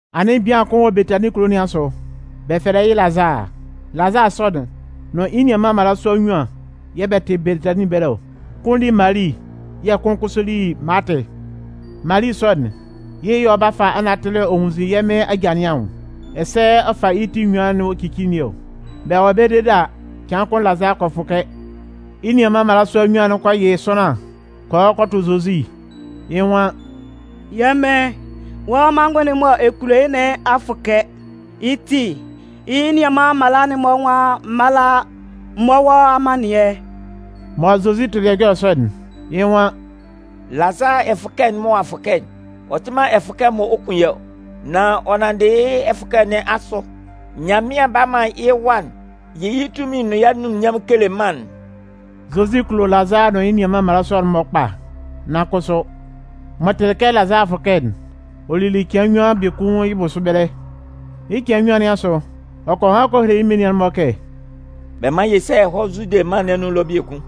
Anɩn bian kʋn wɔ Betanin kulo nɩn asʋ, bɛ fɛlɛ yɩ́ Lazaa. Lazaa sɔ'n nʋn yɩ́ nianman mmalasua nnyuan yɛ̂ bɛ tɩ Betanin ɛbɛlɛ ɔ. Kʋn li Mali yɛ̂ kʋn kʋsʋ li Maatɩ. Mali sɔ'n, yɩ́ yɛ̂ ɔ 'ba fa anatɩlɩ ɔ nwunnzin yɛ́ Mɩn aja'n-mɔ anwʋn, ɛsɛ ɔ fa yɩ́ ti enyuan'n ɔ cici nɩn ɔ. Bɛ wɔ ɛbɛlɛ dede a, cɩan kʋn Lazaa kɔ fʋkɛ. Yɩ́ nianman mmalasua nnyuan'n kɔ yɩ sʋanlan kɔ hɔ kɔ tʋ Zozi. Yɩ́ nwan: “Yɛ́ Mɩn, wɔ́ manngʋn'n mɔ ɛ kulo yɩ́'n nɩn a fʋkɛ. Yɩ́ ti, yɩ́ nianman mmala'n-mɔ nwan m mála m mɔ́ wɔ́ amannɩɛ.” Mɔ Zozi tɩlɩ ɛjɔlɛ sɔ'n, yɩ́ nwan: “Lazaa ɛfʋkɛ'n mɔ ɔ'a fʋkɛ'n, ɔ tɩ man ɛfʋkɛ mɔ ɔ 'kun yɩ́ ɔ. Nan ɔ nanndɩ yɩ́ ɛfʋkɛ sɔ nɩn asʋ, Nyanmɩan 'ba man yɩ́ Wa'n yɩ yɩ́ tunmin'n nʋn yɩ́ anunminnyanmʋn'n kele mân'n.” Zozi kulo Lazaa nʋn yɩ́ nianman mmalasua'n-mɔ kpa, nan kʋsʋ, m'ɔ tɩlɩ kɛ Lazaa a fʋkɛ'n, ɔ lili cɩan nnyuan biekun yɩ́ bʋsʋ ɛbɛlɛ. Yɩ́ cɩan nnyuan nɩn asʋ, ɔ kɔ han kɔ hele yɩ́ menian'n-mɔ kɛ: “Bɛ mán yɛ sá yɛ hɔ́ Zude mân nɩn anun ɛlɔ biekun.”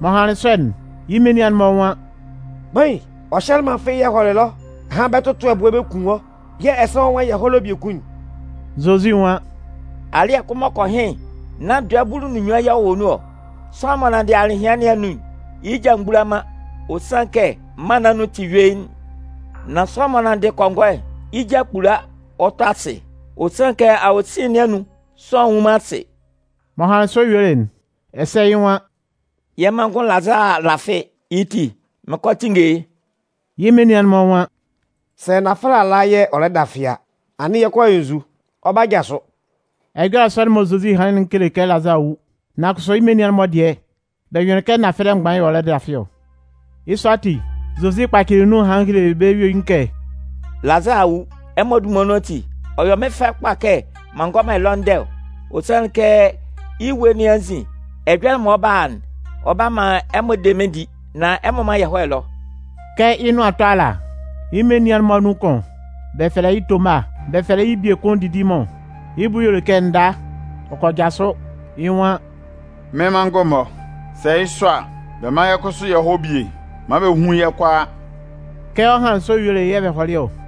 M'ɔ hanlɩn sɔ'n, yɩ́ menian'n-mɔ nwan: “Kpain, ɔ hyɛlɩ man fɩ́ɩ́ yɛ hɔlɩ ɛlɔ ahan bɛ 'tʋtʋ ɛbʋɛ bɛ kun wɔ́, yɛ̂ ɛsɛ wɔ́ nwan yɛ hɔ́ ɛlɔ biekun'n?” Zozi nwan: “Alɩ́ɛ kʋn m'ɔ kɔ hɩn'n, nán dɔɛ bulu nʋn nnyuan yɛ̂ ɔ wɔ nun ɔ? Sʋanlan m'ɔ nanndɩ alɩhɩan nɩn anun'n, yɩ́ ja mgbula man, ɔ sanlɩn kɛ mân nɩn anun tɩ yuein. Nan sʋanlan m'ɔ nanndɩ kɔngɔɛ'n, yɩ́ ja kpula ɔ tɔ asɩ, ɔ sanlɩn kɛ awosin nɩn anun, sʋanlan nnwun man asɩ.” M'ɔ hanlɩn sɔ yuelɩ'n, ɛsɛ yɩ́ nwan: “Yɛ́ manngʋn Lazaa a lafɩ, yɩ́ ti, mɩn 'kɔ a tinnge yɩ́.” Yɩ́ menian'n-mɔ nwan: “Sɛ nafɛlɛ ala yɛ̂ ɔ lɛ dafɩ a, anɩn yɛ 'kɔ a yɔ nzu? Ɔ 'ba jasʋ.” Ɛjɔlɛ sɔ'n mɔ Zozi hanlɩn'n kele kɛ Lazaa a wu, nan kʋsʋ yɩ́ menian'n-mɔ dɩɛ, bɛ jʋnlɩn kɛ nafɛlɛ mgban yɛ̂ ɔ lɛ dafɩ ɔ. Yɩ́ sɔ ati, Zozi kpacɩlɩ nun hanlɩn helelɩ bɛ́ yuein kɛ: “Lazaa a wu. Ɛmɔ dunman nun ati, ɔ yɔ mɩ́n fɛ kpa kɛ m'an ngɔ man ɛlɔ ndɛ ɔ. Ɔ sanlɩn kɛ yɩ́ ewue nɩn anzin ɛjɔlɛ mɔ ɔ 'ba a'n, ɔ 'ba man ɛmɔ de mɩ́n di. Nan ɛmɔ mán yɛ hɔ́ ɛlɔ.” Kɛ yɩ́ nʋan 'tɔ ala, yɩ́ menian'n-mɔ anun kʋn, bɛ fɛlɛ yɩ́ Toma, bɛ fɛlɛ yɩ́ biekun Didimʋn, yɩ́ bʋ y'ɔ le kɛ nda, ɔ kɔ jasʋ, yɩ́ nwan: “Mɩ́n manngʋn-mɔ, sɛ yɩ́ sɔ a, bɛ mán yɛ́ kʋsʋ yɛ hɔ́ bie maan bɛ hún yɛ́ kʋalaa.” Kɛ ɔ hanlɩn sɔ yuelɩ'n, yɛ̂ bɛ hɔlɩ ɔ.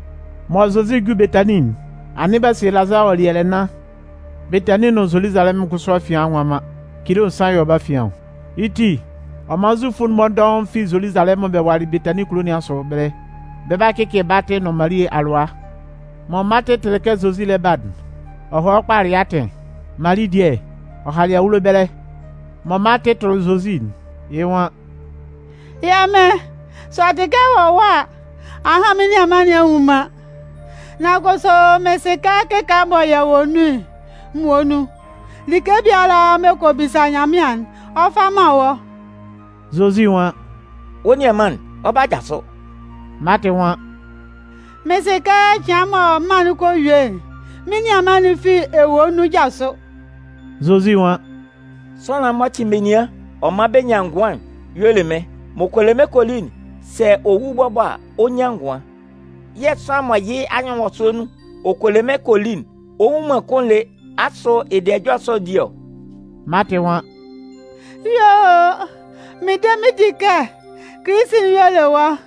Mɔ Zozi 'ju Betanin'n, anɩn b'a sie Lazaa ɔ'a li ɛlɛ nnan. Betanin nʋn Zoluzalɛmʋn kʋsʋ afian a nwa man. Cilo nsan yɛ̂ ɔ wɔ bɛ́ afian ɔ. Yɩ́ ti, ɔ man Zufʋ'n-mɔ dɔʋn fi Zoluzalɛmʋn bɛ walɩ Betanin kulo nɩn asʋ ɛbɛlɛ, bɛ 'ba a cɩcɩ Maatɩ nʋn Mali alʋa. Mɔ Maatɩ tɩlɩ kɛ Zozi lɛ ba'n, ɔ hɔlɩ kpalɩ yɩ́ atɩn. Mali dɩɛ, ɔ halɩ awulo ɛbɛlɛ. Mɔ Maatɩ tʋlɩ Zozi'n, yɩ́ nwan: “Yɛ́ Mɩn, sɛ ɔ tɩ kɛ ɛ wɔ ɛwa a, ahan mɩ́n nianman nɩn a nwu man. Nan kʋsʋ mɩn sɩ kɛ kɩkaala mɔ yɛ wɔ nun'n muonun, like biala mɔ ɛ kɔ bisa Nyanmɩan'n, ɔ 'fa man wɔ́.” Zozi nwan: “Wɔ́ nianman'n, ɔ 'ba jasʋ.” Maatɩ nwan: “Mɩn sɩ kɛ cɩan mɔ mân'n kɔ yue'n, mɩ́n nianman'n fi ewue nun 'jasʋ.” Zozi nwan: “Sʋanlan'n m'ɔ cɩn menian ɔ man bɛ́ ngʋan'n y'ɔ le mɩ́n. M'ɔ kɔ le mɩ́n kɔ li'n, sɛ ɔ wu bɔbɔ a, ɔ 'nyan ngʋan. Yɛ̂ sʋanlan mɔ yɩ́ anyɩnwɔsʋɛ nun ɔ kɔ le mɩ́n kɔ li'n, ɔ nwu man kʋ́n lé. Asʋ ɛ de ɛjɔlɛ sɔ'n di ɔ?” Maatɩ nwan: “Yuo o, mɩn de mɩn di kɛ Kilisi'n y'ɔ le wɔ́,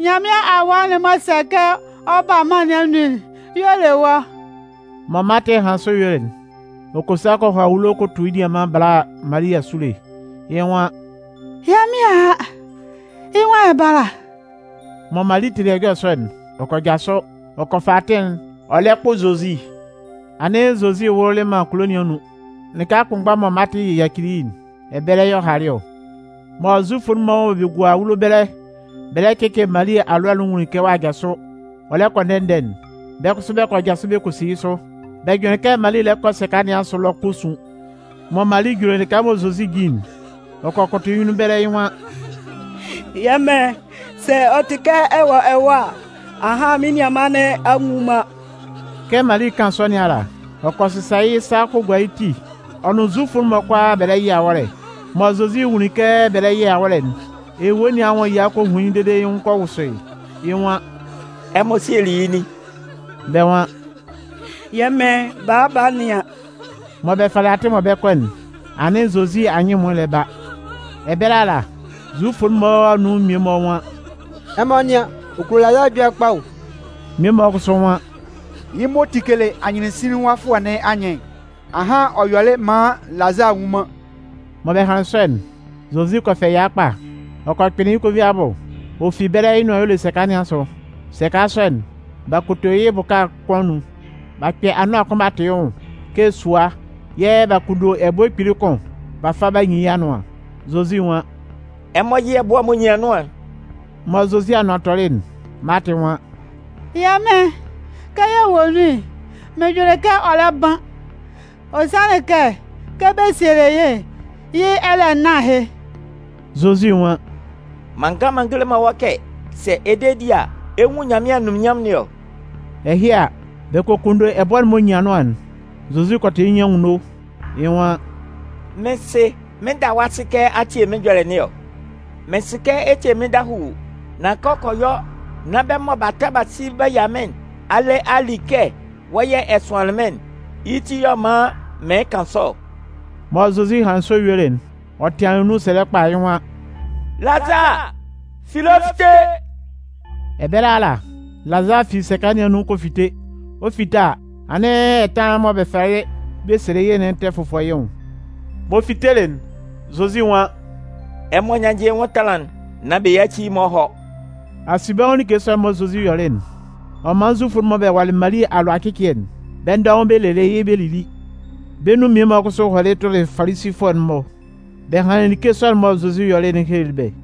Nyanmɩan Awa'n m'ɔ sɛ kɛ ɔ ba mân nɩn anun'n y'ɔ le wɔ́.” Mɔ Maatɩ hanlɩn sɔ yuelɩ'n, ɔ kɔ sa kɔ hɔ awulo kɔ tu yɩ́ nianman bala Mali asule, yɩ́ nwan: “Yɛ́ Mɩn a a, yɩ́ nwan ɛ bála.” Mɔ Mali tɩlɩ ɛjɔlɛ sɔ'n, ɔ kɔ jasʋ, ɔ kɔ fa atɩn'n, ɔ lɛ kpʋ Zozi. Anɩn Zozi wʋlʋlɩ man kulo nɩn anun, lɩka kʋnmgba'n mɔ Maatɩ yacili yɩ́'n, ɛbɛlɛ yɛ̂ ɔ halɩ ɔ. Mɔ Zufʋ'n-mɔ mɔ bɛ gua awulo ɛbɛlɛ bɛ lɛ cɩcɩ Mali alʋa'n nwunlin kɛ ɔ'a jasʋ, ɔ lɛ kɔ ndɛ-ndɛ'n, bɛ́ kʋsʋ bɛ kɔ jasʋ bɛ kɔ si yɩ́ sʋ. Bɛ jʋnlɩn kɛ Mali lɛ kɔ sɛka nɩn asʋ ɛlɔ 'kɔ sun. Mɔ Mali juli lɩka mɔ Zozi jin'n, ɔ kɔ kʋtʋ yɩ́ nyunnun ɛbɛlɛ, yɩ́ nwan: “Yɛ́ Mɩn, sɛ ɔ tɩ kɛ ɛ wɔ ɛwa a, ahan mɩ́n nianman nɩn a nwu man.” Kɛ Mali 'kan sɔ nɩn ala, ɔ kɔ sɩsa yɩ́ sa kɔ gua yɩ́ ti ɔ nʋn Zufʋ'n-mɔ kʋalaa bɛ lɛ yɩ awɔ́lɛ. Mɔ Zozi nwunlin kɛ bɛ lɛ yɩ awɔ́lɛ'n, ewue nɩn anwʋn ɛya kɔ hun yɩ́ dede yɩ́ nwʋn kɔ wʋsʋ yɩ́. Yɩ́ nwan: “Ɛmɔ sielɩ yɩ́ nin?” Bɛ́ nwan: “Yɛ́ Mɩn, bala ba nɩan.” Mɔ bɛ falɩ atɩn'n mɔ bɛ 'kɔ'n, anɩn Zozi anyɩn ɛmʋɩn lɛ ba. Ɛbɛlɛ ala, Zufʋ'n-mɔ anun mmie-mɔ nwan: “Ɛmɔ nɩ́an, ɔ kulo Lazaa ɛjɔlɛ kpa o!” Mmie-mɔ kʋsʋ nwan: “Yɩ́ m'ɔ tikelɩ anyɩnsinlinwafʋɛ nɩn anyɩn'n, ahan ɔ yɔlɩ maan Lazaa a wu man” Mɔ bɛ hanlɩn sɔ'n, Zozi kɔ fɛ ɛya kpa, ɔ kɔ kpɩnlɩn yɩ́ konvin abʋ. Ɔ fi ɛbɛlɛ yɩ́ nʋan y'ɔ le sɛka nɩn asʋ. Sɛka sɔ'n, b'a koto yɩ́ bʋka kʋn anun, b'a kpɛ anʋan kʋn b'a tʋ yɩ́ nwʋn kɛ sua yɛ̂ b'a kunndo ɛbʋɛ kpili kʋn b'a fa b'a nyin yɩ́ anʋan. Zozi nwan: “Ɛmɔ yɩ́ ɛbʋɛ'n m'ɔ nyin anʋan'n.” Mɔ Zozi anʋan tɔlɩ'n, Maatɩ nwan: “Yɛ́ Mɩn, kɛ yɛ wɔ nun'n, mɩn jʋnlɩn kɛ ɔ lɛ ban. Ɔ sanlɩn kɛ, kɛ bɛ sielɩ yɩ́'n, yɩ́ ɛlɛ nnan ahɩ.” Zozi nwan: “M'an ngan m'an ngele man wɔ́ kɛ sɛ ɛ de di a, ɛ 'nwun Nyanmɩan anunminnyanmʋn nɩn ɔ?” Ɛhɩ a, bɛ kɔ kunndo ɛbʋɛ'n m'ɔ nyin anʋan'n. Zozi kɔ tʋ yɩ́ ti anwunno, yɩ́ nwan: “Mɩ́n Sɩ, mɩn 'da wɔ́ asɩ kɛ a tie mɩ́n ɛjɔlɛ nɩn ɔ. Mɩn sɩ kɛ ɛ tie mɩ́n dahuu, nan kɛ ɛ kɔ yɔ nán bɛ́ mɔ b'a ta b'a si b'a yia mɩ́n nɩn a le a li kɛ wɔ́ yɛ̂ ɛ sʋanlɩn mɩ́n'n, yɩ́ ti yɛ̂ ɔ man mɩɩn kan sɔ ɔ.” Mɔ Zozi hanlɩn sɔ yuelɩ'n, ɔ tɩanlɩn nun sɛlɛ kpa, yɩ́ nwan: “Lazaa, fi ɛlɔ fite!” Ɛbɛlɛ ala, Lazaa fi sɛka nɩn anun kɔ fite. Ɔ 'fite a, anɩn ɛtanlan'n mɔ bɛ falɩ bɛ sielɩ yɩ́'n tɛ fʋfɔ yɩ́ nwʋn. M'ɔ fitelɩ'n, Zozi nwan: “Ɛmɔ nyánnjɩ yɩ́ nwʋn ɛtanlan'n, nán bɛ yáci yɩ́ maan ɔ hɔ́.” Asinbɛnwʋn like sɔ'n mɔ Zozi yɔlɩ'n, ɔ man Zufʋ'n-mɔ mɔ bɛ walɩ Mali alʋa ɛcɩcɩɛ'n, bɛ́ dɔʋn bɛ lelɩ yɩ́ bɛ lili. Bɛ́ nun mmie-mɔ kʋsʋ hɔlɩ tʋlɩ Falisifʋɛ'n-mɔ bɛ hanlɩn like sɔ'n mɔ Zozi yɔlɩ'n helelɩ bɛ́.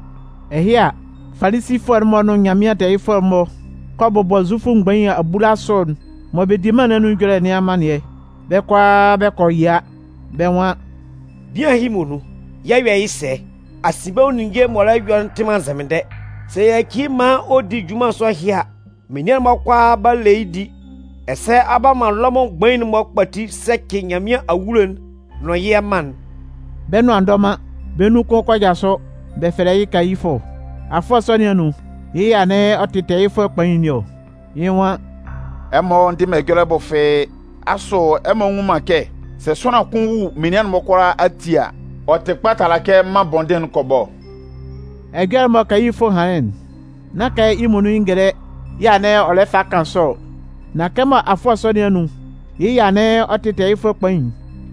Ɛhɩ a, Falisifʋɛ'n-mɔ nʋn Nyanmɩan tɛɛyɩfʋɛ mgbain'n-mɔ kɔ bʋbɔ Zufʋ mgbain abulasʋ'n mɔ bɛ di bɛ́ mân nɩn anun ɛjɔlɛ nɩn amannɩɛ, bɛ́ kʋalaa bɛ kɔ yia, bɛ́ nwan: “Bian ɛhɩ muonun, yɛ 'yɔ yɩ́ sɛ? Asinbɛnwʋn ninnge m'ɔ lɛ yɔ'n tɩ man nzɛmɩndɛ. Sɛ yɛ yaci yɩ́ maan ɔ di junman sɔ ɛhɩ a, menian'n-mɔ kʋalaa 'ba le yɩ́ di, ɛsɛ ɔ 'ba man Lɔmʋn mgbain'n-mɔ kpati sɛcɩ Nyanmɩan awulo'n nʋn yɛ́ mân'n!” Bɛ́ nʋan a ndɔ man, bɛ́ nun kʋn kɔ jasʋ, bɛ fɛlɛ yɩ́ Kayifʋ. Afʋɛ sɔ nɩn anun, yɩ́ yɛ̂ anɩn ɔ tɩ Tɛɛyɩfʋɛ Kpain nɩn ɔ. Yɩ́ nwan: “Ɛmɔ ndɩ man ɛjɔlɛ bʋ fɩ́ɩ́! Asʋ ɛmɔ nnwun man kɛ sɛ sʋanlan kʋn wu menian'n-mɔ kʋalaa ati a, ɔ tɩ kpa tala kɛ mân bɔndɩn'n kɔ bɔ ɔ?” Ɛjɔlɛ'n mɔ Kayifʋ hanlɩn'n, nán kɛ yɩ́ muonun yɩ́ ngɛlɛ yɛ̂ anɩn ɔ lɛ fa kan sɔ ɔ. Nan kɛmɔ afʋɛ sɔ nɩn anun yɩ́ yɛ̂ anɩn ɔ tɩ tɛɛyɩfʋɛ kpain'n,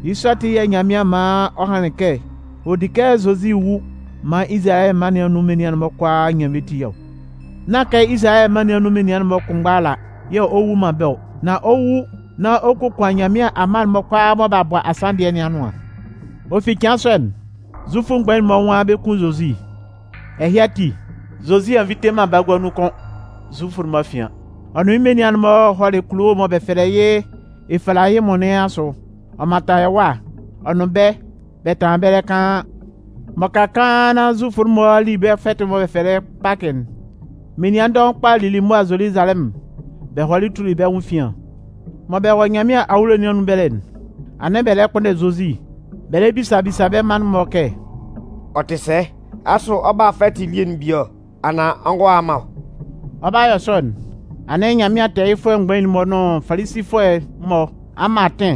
yɩ́ sɔ ati yɛ̂ Nyanmɩan man ɔ hanlɩn kɛ ɔ di kɛ Zozi wu maan Izalayɛ mân nɩn anun menian-mɔ kʋalaa nyan bɛ́ ti ɔ. Nán kɛ Izalayɛ mân nɩn anun menian'n-mɔ kʋnmgba ala yɛ̂ ɔ 'wu man bɛ́ ɔ, nan ɔ 'wu nán ɔ kokuan Nyanmɩan amma'n-mɔ kʋalaa mɔ b'a bɔ asanndɩɛ nɩn anʋan. Ɔ fi cɩan sɔ'n, Zufʋ mgbain'n-mɔ nwan bɛ 'kun Zozi. Ɛhɩ ati, Zozi a nvite man bagua nun kʋ́n Zufʋ'n-mɔ afian. Ɔ nʋn yɩ́ menian'n-mɔ hɔlɩ kulo'n mɔ bɛ fɛlɛ yɩ́ Efalayimʋn nɩn asʋ. Ɔ mantan ɛwâ. Ɔ nʋn bɛ́, bɛ tanlanlɩn ɛbɛlɛ kaan. M'ɔ ka kaan nán Zufʋ'n-mɔ a li bɛ́ fɛtɩ'n mɔ bɛ fɛlɛ yɩ́ Pakɩ'n, menian dɔʋn kpa lili mʋa Zoluzalɛmʋn bɛ hɔlɩ tuli bɛ́ nwʋn efian. Mɔ bɛ wɔ Nyanmɩan awulo nɩn anun ɛbɛlɛ'n, anɩn bɛ lɛ kpʋnndɛ Zozi. Bɛ lɛ bisa bisa bɛ́ manngʋn'n-mɔ kɛ: “Ɔ tɩ sɛ, asʋ ɔ 'ba a fɛtɩ elie'n bie anaan ɔ ngɔ a man ɔ?” Ɔ 'ba yɔ sɔ'n, anɩn Nyanmɩan tɛɛyɩfʋɛ mgbain'n-mɔ nʋn Falisifʋɛ'n-mɔ a man atɩn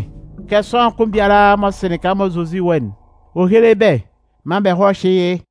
kɛ sʋanlan kʋn biala m'ɔ sɩ lɩka mɔ Zozi wɔ'n, ɔ héle bɛ́ maan bɛ hɔ́ hyɩ́ yɩ́.